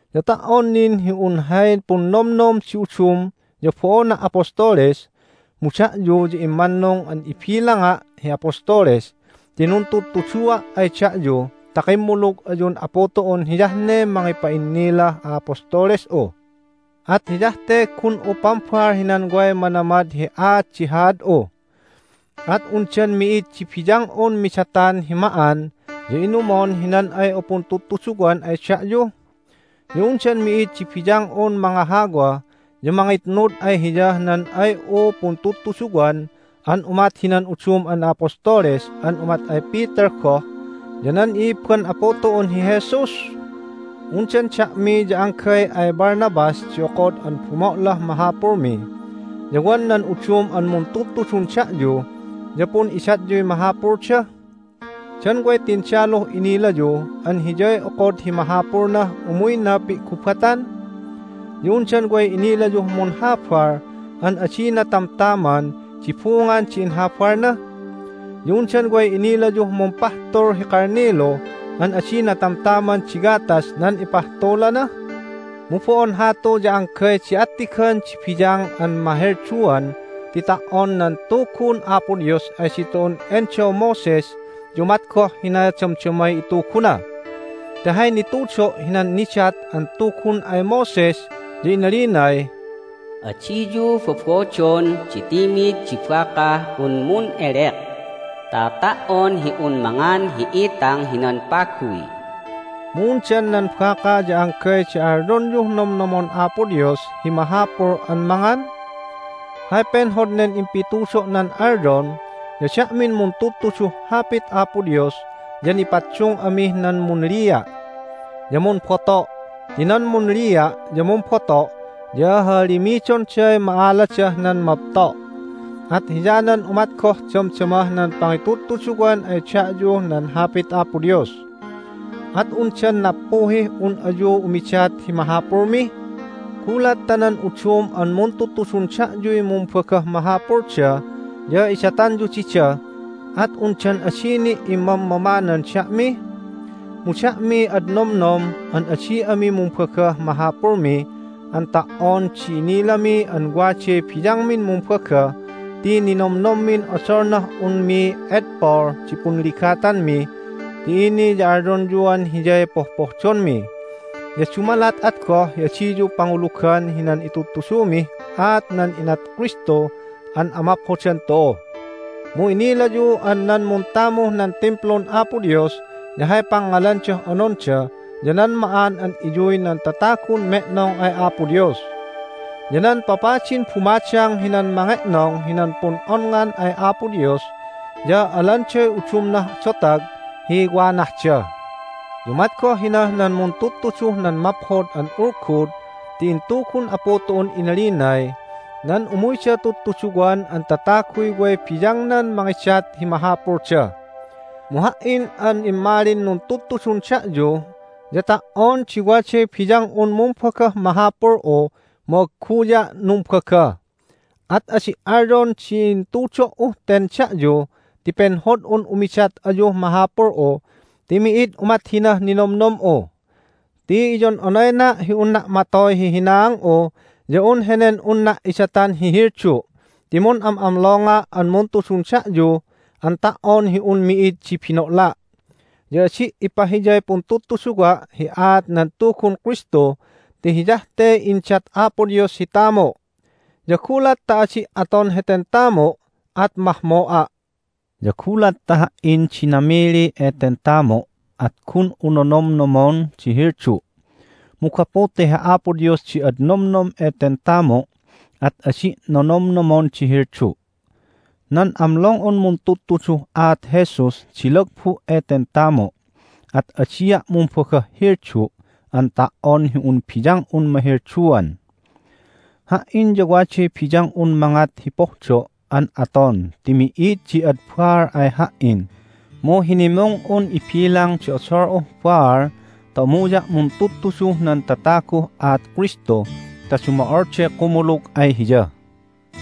Ya ta"on nin hi un hay punnomnom di udum ya bo'ona' apostoles, mu da'yu ya immannung an ibilanga' hi apostoles ti nuntuddutuddua' ay da'yu ta kimmulug ayun Apu tu'un hiyah ne mangipa'innilah a'apostoles'u. At hiyah te gun'u pambal hinan way manamad hi aat di haad'u. At undan mi'id di biyang'un midatan hi ma'an ya inumon hinan ay'u puntudtuduwan ay da'yu? Ya undan mi'id di biyang'un mangahawa ya mangitnud ay hiyah nan ay'u puntudtuduwan an umat hinan udum an a'apostoles an umat ay Peter goh ya nan i'ibban Apu tu'un hi Jesus? Undan da'mi ya anggay ay Barnabas di okod an bumo'lah mahapulmi, ya wan nan udum an muntudtudun da'yu ya pun'idatyuy mahapulda? Dan way tindaluh inilayu an hiyay okod hi mahapulnah umuyna pi'gubatan? Ya undan way inilayuh munhabal an adina tamtaman di bungan di inhabalna? Ya undan way inilayuh mumpahtul hi kalnilu an adina tamtaman di gatas nan ipahtulana? Mu bo'on hatu ya anggay di attigan di biyang an mahelduan ti ta"on nan Tugun Apo Dios ay ditu'un endaw Moses ya umat goh hina damdamay ituguna. Ti hay nitudo' hinan nidat an Tugun ay Moses ya inalinay, "Adiyu bobodon di timid di bakah un mun'elek ta ta"on hi un mangan hi itang hinan paguy." Mu undan nan baka ya anggay di alyonyuh nomnomon Apo Dios hi mahapul an mangan? Hay penhod nen impitudo'nan alyon ya da'min muntudtuduh Hapit Apo Dios ya nipaddung amih nan munlia' ya mumboto' ti nan munlia' ya mumboto' ya hahalimidonday ma'aladah nan mabto'. At hiyanan umat goh damdamah nan pangitudtuduwan ay da'yuh nan Hapit Apo Dios. At undan nappuhih un ayu umidat hi mahapulmi? Gulat ta nan udum an muntudtudun da'yuy mumbagah mahapulda ya idatanyu dida, at undan adi ni' immammamanan da'mi? Mu da'miy ad nomnom an adi ami mumbagah mahapulmi an ta"on di inilami an waday biyangmin mumbaga ti ninomnommin odolnah unmi edpol di punligatanmi ti ini ya alyonyuan hiyay pohpohdonmi, ya dumalat at goh hi adiyu pangulugan hinan itudtudumih aat nan inat Kristu an amaphodan tu'u. Mu inilayu an nan muntamuh nan Timplun Apo Dios ya hay pangngalandah ononda ya nan ma'an an iyuy nan tatagun me'nong ay Apo Dios. Ya nan papadin bumadang hinan mange'nong hinan pun'onngan ay Apo Dios ya alanday udumnah dotag hi wanahda. Ya umat goh hinah nan muntudtuduh nan Maphod an Ulgud ti intugun Apu tu'un inalinay nan umuyda tudtuduwan an tataguy way biyangnan mangidat hi mahapulda. Mu ha"in an immalin nuntudtudun da'yu ya ta"on di waday biyang'un mumbagah mahapul'u mu agguya' numbaga. At adi' alyon di intudo"uh ten da'yu ti penhod'un umidat ayuh mahapul'u ti mi'id umat hinah ninomnom'u. Ti iyon'onayna' hi unna' matoy hi hinaang'u ya un henen unna' idatan hi heldu' ti mun'amlonga' an muntudun da'yu an ta"on hi un mi'id di bino'la. Ya adi' ipahiyay puntudtuduwa' hi aat nan Tugun Kristu ti hiyah te indat Apo Dios hi tamu'. Ya gulat ta adi' aton heten tamu' at mahmo'a'. Ya gulat ta ha"in di namili eten tamu' at gun'u nonomnomon di heldu'. Mu gapu ta hi Apo Dios di ad nomnom eten tamu' at adi' nonomnomon di heldu'. Nan amlong'un muntudtuduh aat Jesus di lagbu' eten tamu', at adia' mumbagah heldu' an ta"on hi un biyang'un mahelduan. Ha"in ya waday biyang'un mangat hi pohdo' an aton ti mi'id di ad baal ay ha"in, mu hinimung'un ibilang di odol'uh baal ta umuya' muntudtuduh nan tataguh aat Kristu ta dumo'olday kumulug ay Hiya.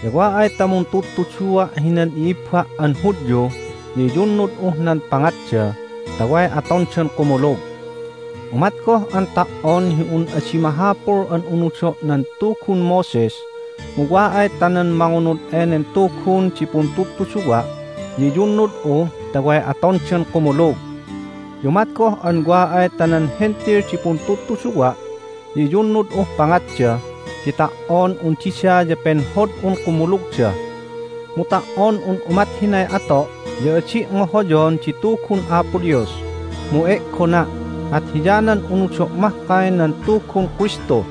Ya wa ay ta muntudtudua' hinan i'ibba' an Hudyu ya iyunnud'uh nan pangatda ta way atondan kumulug. Umat goh an ta"on hi un adi mahapul an unudo' nan Tugun Moses, mu wa ay ta nan mangunud enen Tugun di puntudtuduwa' ya iyunnud'u ta way atondan kumulug. Ya umat goh an wa ay ta nan Hentil di puntudtuduwa' ya iyunnud'uh pangatda, ti ta"on un dida ya penhod'un kumulugda. Mu ta"on un umat hinay ato' ya adi' ngohoyon di Tugun Apo Dios, mu e'gona', at hiyanan unudo' mahkay nan Tugun Kristu.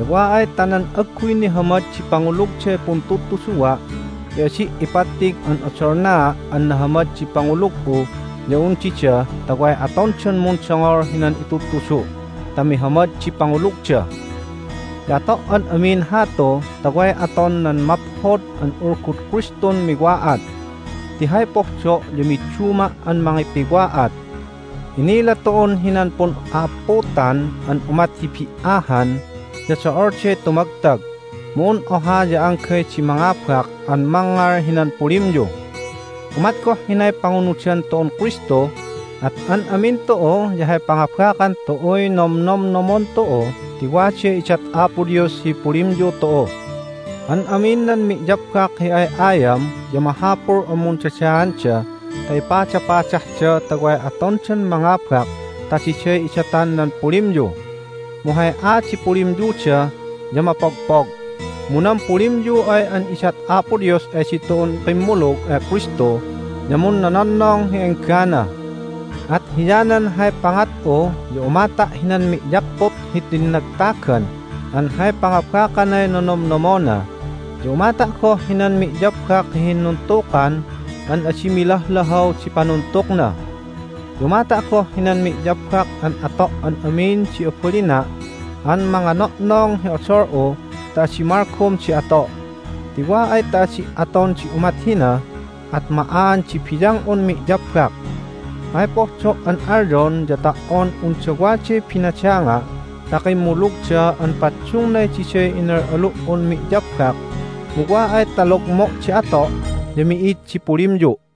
Ya wa ay ta nan agguy nihamad di pangulugday puntudtuduwa' ya adi' ipattig an odolnaa' an nahamad di pangulug'u ya un dida ta way atondan mundongol hinan itudtudu' ta mihamad di pangulugda. Ya ato' an amin hatu ta way aton nan Maphod an Ulgud Kristun miwa'at. Ti hay pohdo' ya midduma' an mangipiwa'at. Inila tu'un hinan pun'a'apputan an umat hi bi"ahan ya do'olday tumagtag, mu un oha ya anggay di mangabak an mangngal hinan pulimyu. Umat goh hinay pangunudan tu'un Kristu, at an amin tu'u ya hay pangabakan tu'uy nomnomnomon tu'u ti waday idat Apo Dios hi pulimyu tu'u. An amin nan mi'yabbak hi ay'ayam ya mahapul an mundadaanda ta ipadapadahda ta way atondan mangabak ta diday idatan nan pulimyu. Mu hay aat di pulimyuda ya mapogpog, mu nan pulimyu ay an idat Apo Dios ay ditu'un kimmulug ay Kristu ya munnononnong hi enggana. At hiyanan hay pangat'u ya umata' hinan mi'yapput hi tinnagtagan an hay pangabakanay nonomnomona, ya umata' goh hinan mi'yabbak hi hinnuntukan an adi milahlahaw di panuntukna. Ya umata' goh hinan mi'yabbak an ato' an amin di abalina' an mangano'nong hi odol'u ta adi malgom di ato', ti wa ay ta adi' aton di umat hina at ma'aan di biyang'un mi'yabbak. Hay pohdo' an alyon ya ta"on unda waday binadanga' ta kimmulugda an paddungnay diday inal'alu"un mi'yabbak, mu wa ay ta logmo' di ato' ya mi'id di pulimyu'.